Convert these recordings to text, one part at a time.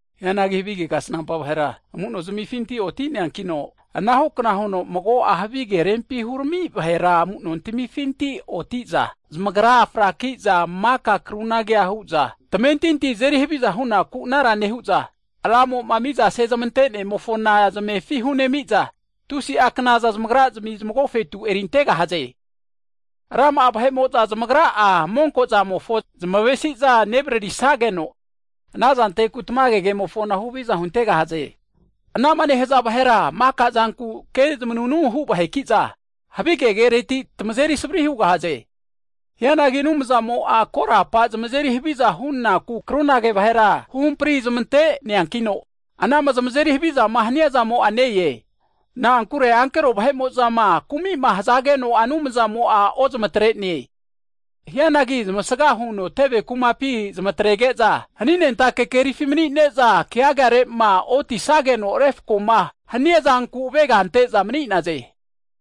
Hianagi havige kasnampa vahera, amu'nozmifinti oti'neankino, anahukna huno mago'a havige rempi hurami vahera amu'nontamifinti oti'za, zamagra fraki'za maka krunage hu'za, tamentinti azeri haviza hu'naku anara nehu'za, Ramo'ma miza sezmante'nemofona zamefi hu'nemi'za, tusi'a knaza zamagrazmi zmagofetu erintegahaze. Rama'a vahe'mo'za zmagra'a monkozamofo zmavesi'za nevaririsageno, anazanteku tamage kemofona huhaviza hunte'gahaze. Anama nehaza vahera maka zanku kezmanunu hu vaheki'za, havi kereti tamazeri savri hugahaze. Hianagi Anumzamo'a korapa zmazeri haviza hunaku krunage vahera huhampri zmante'neankino, anama zmazeri havizama haniazamo'a ne-e. Na'ankure ankero vahe'mozama kumi'ma hazageno'a Anumzamo'a ozamatre'ne, hianagi zmasga huno teve kumapi zmatrege'za, haninentake kerifi mni'ne'za, keagarema otisageno refkoma haniazanku avega ante'za mni'naze.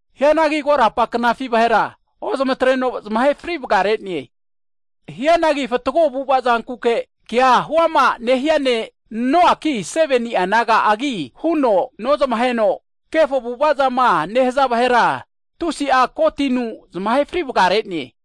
Hianagi korapa knafi vahera, ozamatreno zmahe frivgarene. Hianagi fatgo avu'avazankuke kea huama nehia ne' Noanki 7ni'a naga'agi huno nozmaheno, kefo avu'avazama nehaza vahera, tusi'a ko tinu zmahe frivgarene.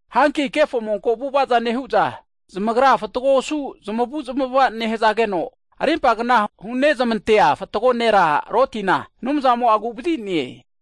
Hanki kefo monko avu'avaza nehu'za, zamagra fatgo osu zamavuzmava nehazageno rimpagna hunezmantea fatgo nera Lotina, Anumzamo'a agu'vazine.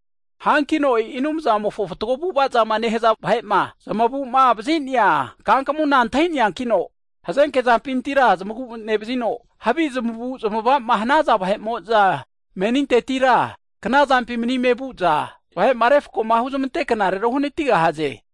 Hankino e'i Anumzamofo fatgo avu'avama nehaza vahema, zamagu'mavazi'nea kankamuna antahineankino, hazenke zampintira zmagu nevazino, havi zmavu'zmavama hanaza vahe'mo'za menintetira knazampi manime vu'za, vahe'ma refkoma huzmante knarera uhnatigahaze.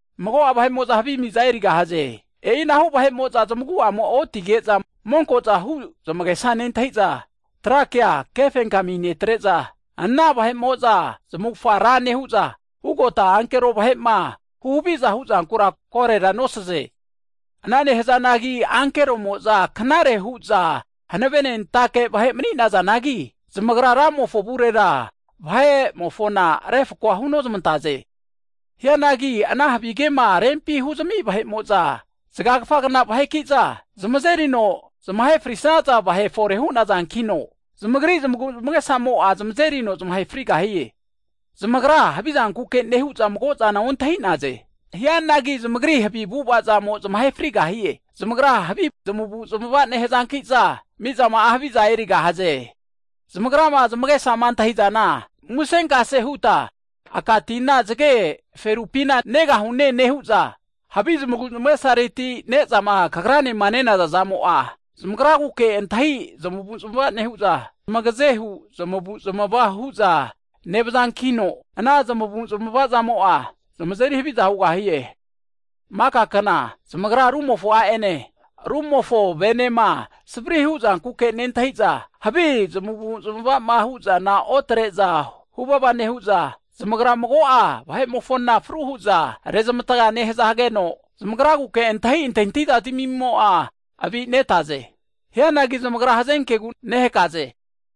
Mago'a vahe'mo'za havi miza erigahaze, e'inahu vahe'mo'za zmaguamo'a otige'za, monko'za hu zmagesama nentahiza, tra kea kefenkami netre'za, ana vahe'mo'za zmavufga ra nehu'za, ugota ankero vahema huhaviza huzankura korora nosaze. Ana nehazanagi ankeromo'za, knare hu'za hanavenentake vahe mni'nazanagi, zamagra Ramofo avurera vahe'mofona refkoa hunozmantaze. Hianagi ana havige rempima huzami vahe'mo'za zgakfagna vaheki'za, zmazeri'za zmahe frisaza vahe fore hu'nazankino, zamagri zmaguzmagesamo zmazerino zmahe frigahie. Zamagra havizankuke nehu'za mago'zana ontahi'naze. Hianagi zamagri havi zmavuzmavazamo zmahe frigahie. Zamagra havi zmavuzmava nehazanki'za, mizama'a haviza erigahaze. Zamagrama zamagesama antahizana, musenkase huta aka tina zge ferupina negahune nehu'za, havi zmaguzmagesareti nezama kagranema nenazazamo'a, zamagraguke antahi zmavuzmava nehu'za, zmagazehu zmavuzamava hu'za nevazankino, ana zmavu'zamavamo'a, zmazeri haviza hugahie. Maka kna, zamagra rumofo a'ene, rumofo venema savrima huzankuke nentahiza, havi zamavu'zamavama huzana otre'za huvava nehu'za, zamagra mago'a vahe'mofona fru hu'za rezmatga nehazageno, zamagraguke antahi antahintahi zmimo'a avi'nete. Hianagi zamagra hazenkegu nehakaze!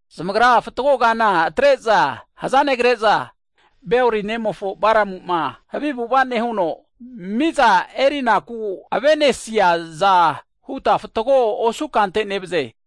Zamagra fatgo kana atre'za hza negraze. Beori nemofo Balamu'ma havi avu'ava nehuno, miza erinaku avenesiaza hu'za fatgo osu kante nevaze.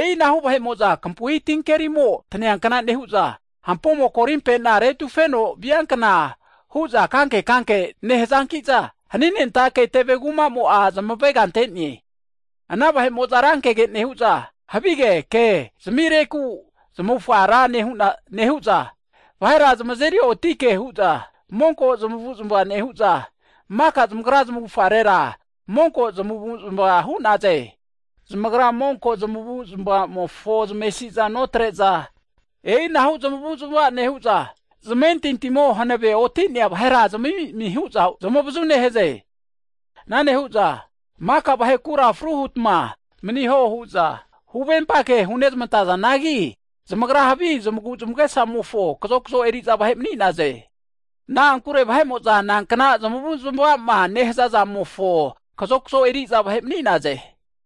E'inahu vahe'mo'za kampui tinkerimo taneankna nehu'za, hampomo korimpena retufeno viankna hu'za kankekanke nehazanki'no, haninentake teve kumamo'a zmavega ante'ne. Ana vahe'mo'za rankege nehu'za, havige ke zamireku zamavufga ra nehu'za, vahera zamazeri oti ke hu'za monko zamavuzmava nehu'za, maka zamagra zamavufarera monko zamavuzmava nehaze. Zamagra monko zamavuzmavamofo zamesizana notre'za, e'inahu zamavuzmava nehu'za zamentintimo hanave oti'nea vahera zamami'mi hu'za zamavazu nehaze. Ana nehu'za, maka vahekura fru hutma maniho hu'za huvempa ke hunezmantazanagi, zamagra havi zamaguzmagesamofo kazokzo eri'za vahe mni'naze. Na'ankure vahe'mo'za nankna zamuzmama nehazazamofo kazokzo eri'za vahe mni'naze.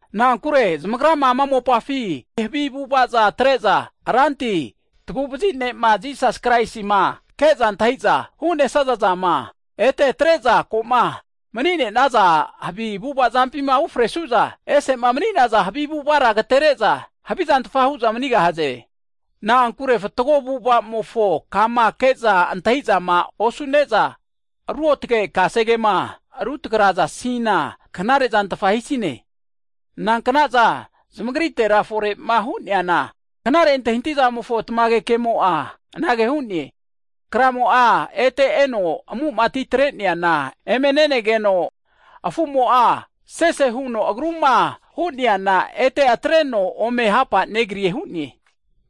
Na'ankure zamagrama ama mopafi havi avu'avaza atre'za, Ranti, Taguvazi Ne'ma Jisas Kraisima ke'za antahiza hu'nesaza zama, ete atre'za koma mni'naza havi avu'avapima ufresu'za, ese'ma mni'naza havi avu'avara agatere'za, havizantfa hu'za manigahaze. Na'ankure fatgo avu'avamofo kama ke'za antahizama osu'neza, ruotge kasegema rutragazasina knarezantfa hisine. Nanknaza zamagritera fore'ma hu'neana, knare antahizamofo tamage kemo'a anage hu'ne, kramo'a ete eno amu'ma atitreneana eme ne'negeno, afumo'a sese huno agruma hu'neana, ete atreno ome hapa negrie hu'ne.